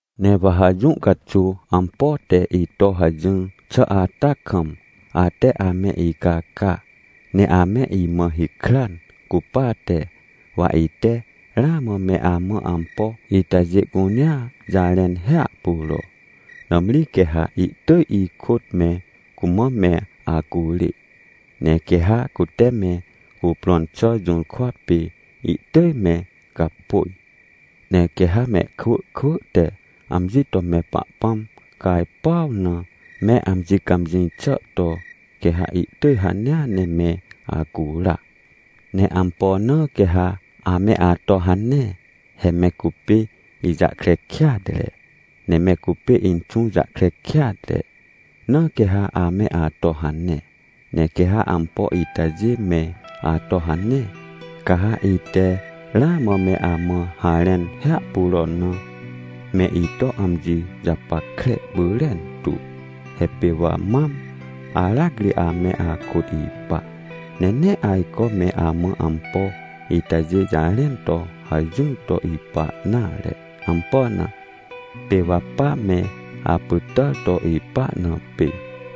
— Ne wa ha jũ caxuw ampo te ito hajỹr xà ata kam, ate ame icaca, ne ame imã hikran cupate, wa ite ramã me amã ampo itajê cunea jarẽn hiahpuro. Nãmri quê ha ihtỳj ikôt me cumã me acurê, ne quê ha cute me cuprõn xà jũrkwa pê, ihtỳj me gapôj. Ne quê ha mehkwỳ kwỳ te amji to me Pahpãm cajpuaw na me amji cãmjĩ xà to, quê ha ihtỳj hanea ne me acura. Ne ampo na quê ha ame ato hane? He me cupê ijahkre kêatre, ne me cupê Inxũ jahkre kêatre, na quê ha ame ato hane. Ne quê ha ampo itajê me ato hane, ca ha ite ramã me amã harẽn hiahpuro na, me ito amji japackre pyrentu. He pê wa mam aracri ame akôt ipa, ne nee ajco me amã ampo itajê jarẽn to hajỹr to ipa nare. Ampo na? Pê wa pa me apytàr to ipa na pê.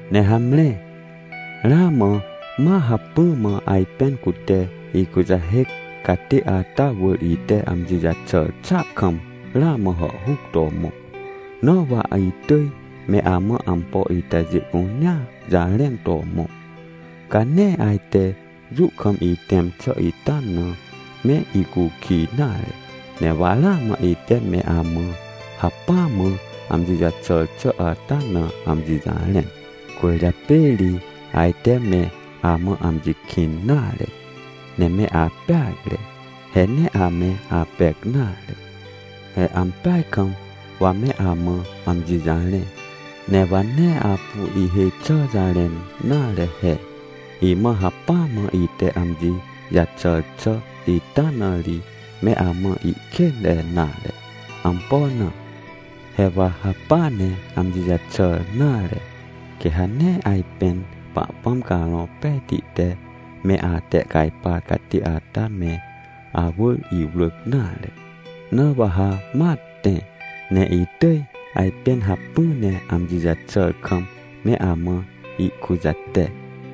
— Ne hamre, ramã ma hacpỹ mã ajpên cute ikujahêc catê ata wỳr ite amji jaxàr xàa kam ramã hàhhuc to mõ, na wa itỳj me amã ampo itajê cunea jarẽn to mõ. Ca nee ajte jũ kam itẽm xà ita na me icukij nare. Ne wa ramã ite me amã hacpỹa mã amji jaxàr xà ata na amji jarẽn, cwỳrjapê ri ajte me amã amji kĩn nare, ne me apeacre. He nee ame apec nare! He ampeaj kam wa me amã amji jarẽ, ne wa nee apu ihêj xi jarẽn nare he. Imãa hacpỹ mã ite amji jaxàr xà ita na ri me amã ihkênre nare. Ampo na? He wa hacpỹa ne amji jaxàr nare, quê ha nee ajpên Pahpãm Carõ Pejti te me atehcajpar catê ata me awỳr iwrỳc nare. Na wa ha ma tẽ, ne itỳj ajpên hacpỹ ne amji jaxà kam me amã ihkujate.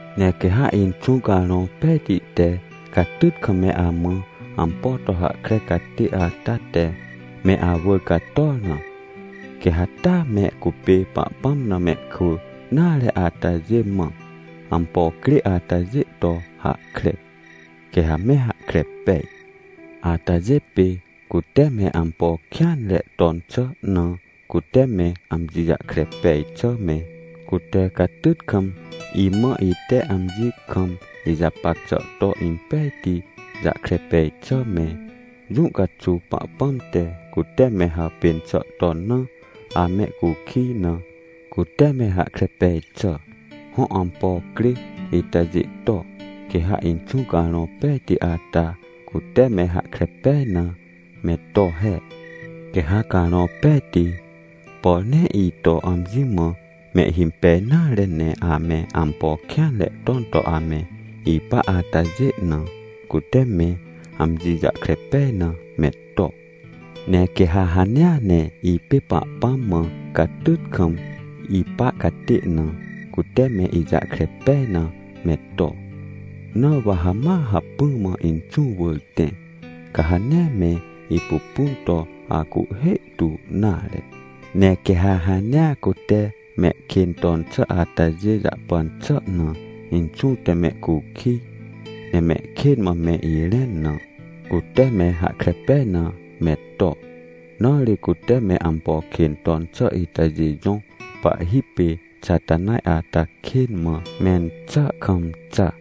— Ne quê ha Inxũ Carõ Pejti te catyt kam me amã ampo to hahkre catê ata te me awỳr cator na, quê ha taa me cupê Pahpãm na mehkwỳ nare atajê mã ampo crê atajê to hahkre, quê hame hahkre pej. Atajê pê, cute me ampo kêanre ton xà na cute me amji jahkre pej xà me, cute catyt kam imã ite amji kam ijapac xà to impejti jahkre pej xà me, jũ caxuw Pahpãm te, cute me hàpên xà ton na amehcukij na cute me hahkre pej xà. Hõ, ampo crê itajê to, quê ha Inxũ Carõ Pejti ata cute me hahkre pej na me to he. Quê ha Carõ Pejti, por nee ito amji mã mehhimpej nare ne ame ampo kêanre ton to ame ipa atajê na, cute me amji jahkre pej na me to. Ne quê ha hanea ne ipê Pahpãm mã catyt kam ipa catê na, cute me ijahkre pej na me to. Na wa hama hacpỹ mã Inxũ wỳr tẽ, ca ha nee me ipupun to acuhhê tu nare. Ne quê ha hanea cute mehkên ton xà atajê jahpan xà na, Inxũ te mehcukij ne mehkên mã me irẽn na, cute me hahkre pej na me to. Na ri cute me ampo kên ton xà itajê jõ pahhi pê Xatanaj ata kên mã mẽn xàa kam xa.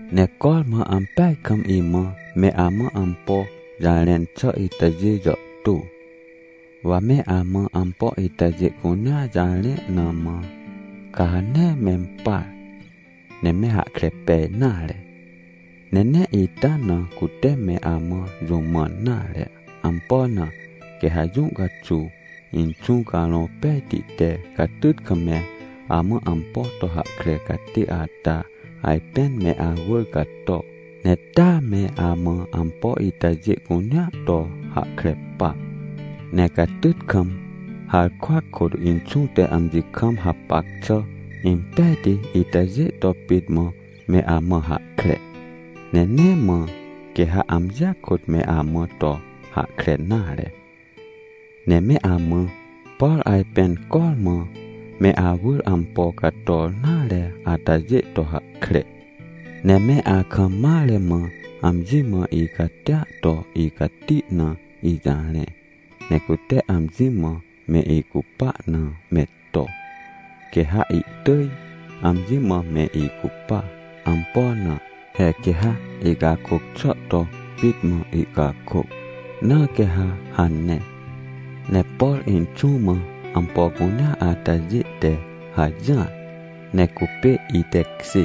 — Ne cormã ampeaj kam imã me amã ampo jarẽn xà itajê jàhtô, wa me amã ampo itajê cunea jarẽ na mã, ca ha nee mempar, ne me hahkre pej nare. Ne nee ita na cute me amã jũ mãn nare. Ampo na? Quê ha jũ caxuw Inxũ Carõ Pejti te catyt kam me amã ampo to hahkre catê ata ajpên me awỳr cato, ne ta ame amã ampo itajê cunea to hahkre pa. Ne catyt kam, harkwa kôt, Inxũ te amji kam hapac xà impejti itajê to pit mã me amã hahkre, ne nee mã, quê ha amjia kôt me amã to hahkre nare. Ne me amã, por ajpên cormã me awỳr ampo cator nare atajê to hahkre. Ne me akam mare mã amji mã icatia to icati na ijarẽ, ne cute amji mã me icupa na me to, quê ha ihtỳj amji mã me icupa. Ampo na? He quê ha icakôc xà to pit mã ihcakôc, na quê ha hane. Ne por Inxũ mã ampo cunea atajê te hajỹar, ne cupê itekjê.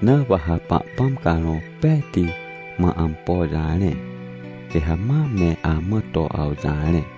Na wa ha Pahpãm Carõ Pejti mã ampo jarẽ, quê ha ma me amã to awjarẽ.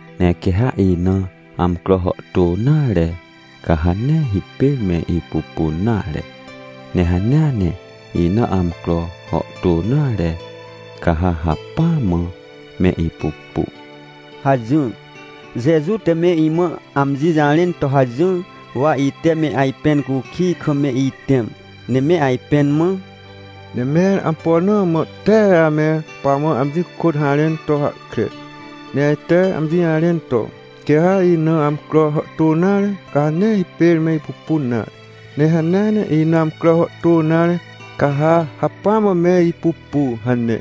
— Ne quê ha ina amcro hàhtô nare, ca ha nee hipêr me ipupun nare. Ne hanea ne ina amcro hàhtô nare, ca ha hacpỹa mã me ipupu — hajỹr. Jeju te me imã amji jarẽn to hajỹr. Wa ite me ajpẽn cukij kam me itẽm, ne me ajpẽn mã: — Ne mẽr ampo na mã tee ame pamã amji kôt harẽn to hahkre. Ne ajte amji jarẽn to: “Quê ha ina amcro hàhtô nare, ca ha nee hipêr me ipupun nare. Ne hanea ne ina amcro hàhtô nare, ca ha hacpỹa mã me ipupu” hane.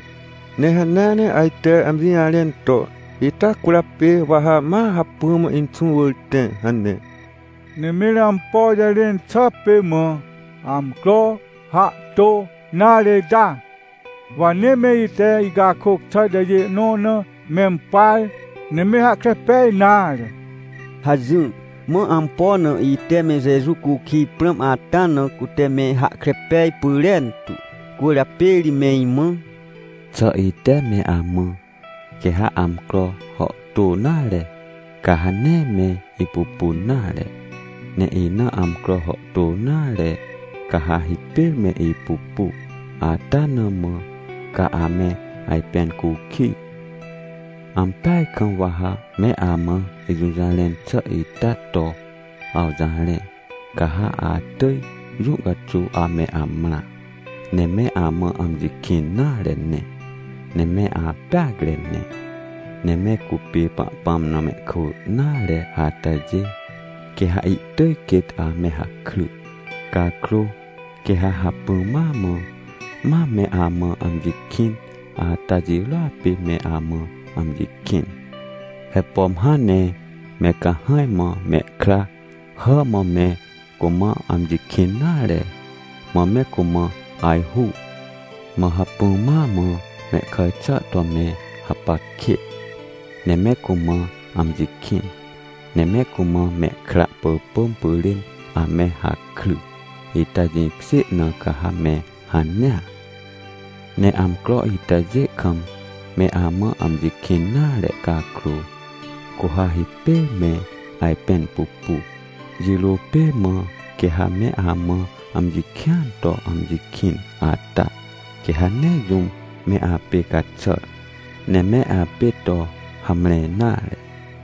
Ne hanea ne ajte amji jarẽn to: “Ita cwỳrjapê wa ha ma hacpỹ mã Inxũ wỳr tẽ” hane. Ne mẽr ampo jarẽn xà pê mã: “…amcro hàhtô nare…” ita? Wa nee me ite ihcakôc xà itajê nõ na mempar, ne me hahkre pej nare — hajỹr. Mã ampo na ite me Jeju cukij prãm ata na cute me hahkre pej pyrentu, cwỳrjapê ri me imã: — Xà ite me amã: “Quê ha amcro hàhtô nare, ca ha nee me ipupun nare, ne ina amcro hàhtô nare ca ha hipêr me ipupu” ata na mã ca ame ajpẽn cukij? Ampeaj kam wa ha me amã ijũjarẽn xà ita to awjarẽ. Ca ha atỳj jũ caxuw ame amrã, ne me amã amji kĩn nare ne, ne me apeacre ne. Ne me cupê Pahpãm na mehkwỳ nare atajê, quê ha ihtỳj quêt ame hakry. Cakrô, quê ha hacpỹ ma mã mam me amã amji kĩn ata jirôa pê me amã amji kĩn. He pom hãn ne me cahãj mã mehkra hà mã me cumã amji kĩn nare, mã me cumã ajhu, mã hacpỹ ma mã mehkàj xà to me hapac kêt, ne me cumã amji kĩn, ne me cumã mehkra pỳpỳm pyrên ame hakry, ita jĩkjê na ca ha me hanea. Ne amcro itajê kam me amã amji kĩn nare cakrô, cu ha hipêr me ajpẽn pupu. Jirô pê mã quê ha me amã amji kĩan to amji kĩn ata, quê ha nee jũm me apê caxàr, ne me apê to hamre nare.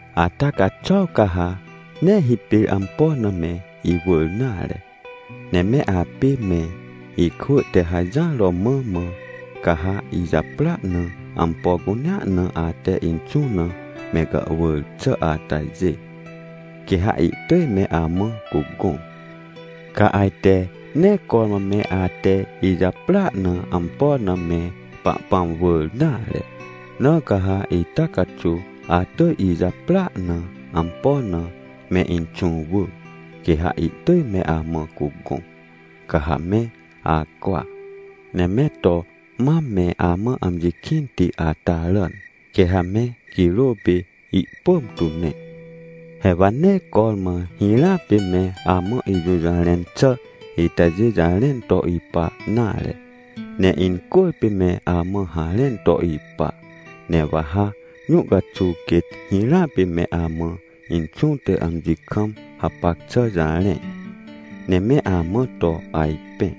— Ata caxuaw ca ha nee hipêr ampo na me iwỳr nare, ne me apê me ikwỳ te hajỹr romã mã, ca ha ijaprỳa na, ampo cunea na ate Inxũ na me gàhwỳr xà atajê, quê ha ihtỳj me amã cugõ. Ca ajte nee cormã me ate ijaprỳa na ampo na me Pahpãm wỳr nare. Na ca ha ita caxuw atỳj ijaprỳa na ampo na me Inxũ wỳ, quê ha ihtỳj me amã cugõ, ca ha me acwa, ne me to mam me amã amji kĩnti ata ràn, quê ha me girô pê ihpỳm tu ne. — He wa nee cormã hirãa pê me amã ijũjarẽn xà itajê jarẽn to ipa nare, ne incwỳrpê me amã harẽn to ipa. Ne wa ha jũ caxuw quêt hirãa pê me amã Inxũ te amji kam hapac xà jarẽ, ne me amã to ajpẽ.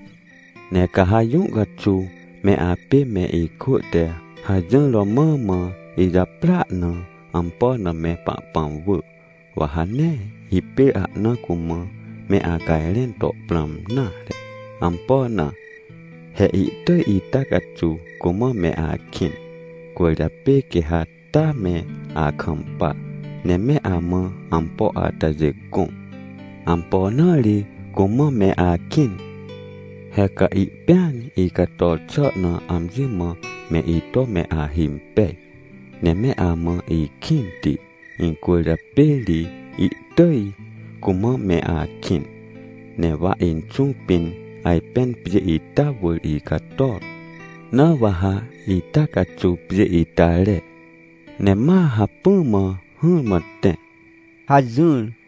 Ne ca ha jũ caxuw me apê me ikwỳ te hajỹr romã mã ijaprỳa na ampo na me Pahpãm wỳ, wa ha nee hipêr ahna cumã me acajrẽn to prãm nare. Ampo na? He ihtỳj ita caxuw cumã me akĩn, cwỳrjapê quê ha taa me akampa, ne me amã ampo atajê gõ. Ampo na ri cumã me akĩn? He ca ihpĩan icator xà na amji mã me ito me ahimpej, ne me amã ikĩnti incwỳrjapê ri ihtỳj cumã me akĩn. Ne wa Inxũ pĩn ajpên pjê ita wỳr icator, na wa ha ita caxuw pjê ita re, ne ma hacpỹ mã hỹrmã tẽ — hajỹr.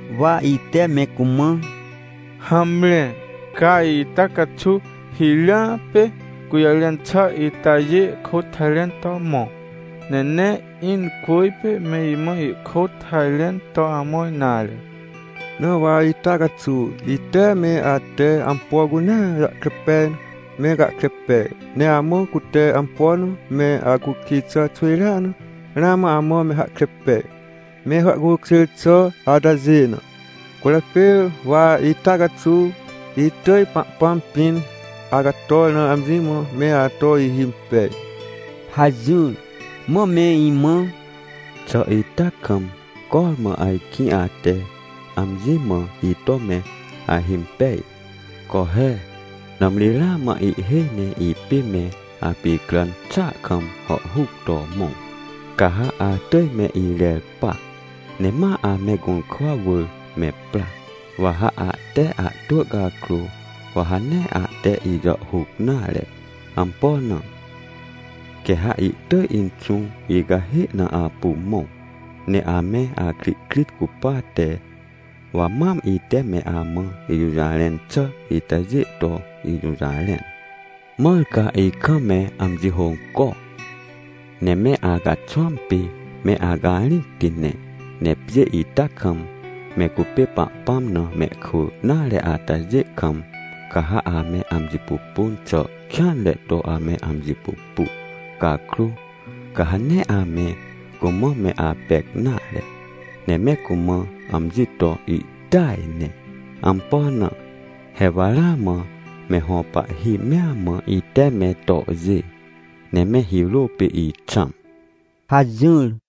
Wa ite me cumã: — Hamre, ca ita caxuw hirãa pê gũjarẽn xà itajê kôt harẽn to mõ. Ne nee incwỳrpê me imã ihkôt harẽn to amõr nare. Na wa ita caxuw, ite me ate ampo cunea jahkre pej na me gahkre pej, ne amã cute ampo na me acukij xà xwỳjrea na, ramã amã me hahkre pej, me hàhcukjêr xà atajê na. Cwỳrjapê wa ita caxuw itỳj Pahpãm pĩn acator na amji mã me ato ihimpej — hajỹr. Mã me imã: — Xà ita kam cormã, ajkĩ ate amji mã ito me ahimpej? Co he, nãmri ramã ihhêj ne ipê me apicràn xàa kam hàhhuc to mõ. Ca ha atỳj me irer pa, ne ma ame gũrkwa wỳr me pra, wa ha ahte ahtwỳ cakrô, wa ha nee ahte ijàhhuc nare. Ampo na? Quê ha ihtỳj Inxũ icahê na apu mõ. Ne ame akrihkrit cupate, wa mam ite me amã ijũjarẽn xà itajê to ijũjarẽn. Mãr ca ikam me amji hônco, ne me acaxwãm pê me acarĩcti ne. Ne pjê ita kam, me cupê Pahpãm na mehkwỳ nare atajê kam, ca ha ame amji pupun xà kêanre to ame amji pupu. Cakrô, ca ha nee ame cumã me apec nare, ne me cumã amji to ihtỳaj ne. Ampo na? He wa ramã me hõ pahhi mea mã ite me tohjê, ne me hirô pê ixãm — hajỹr.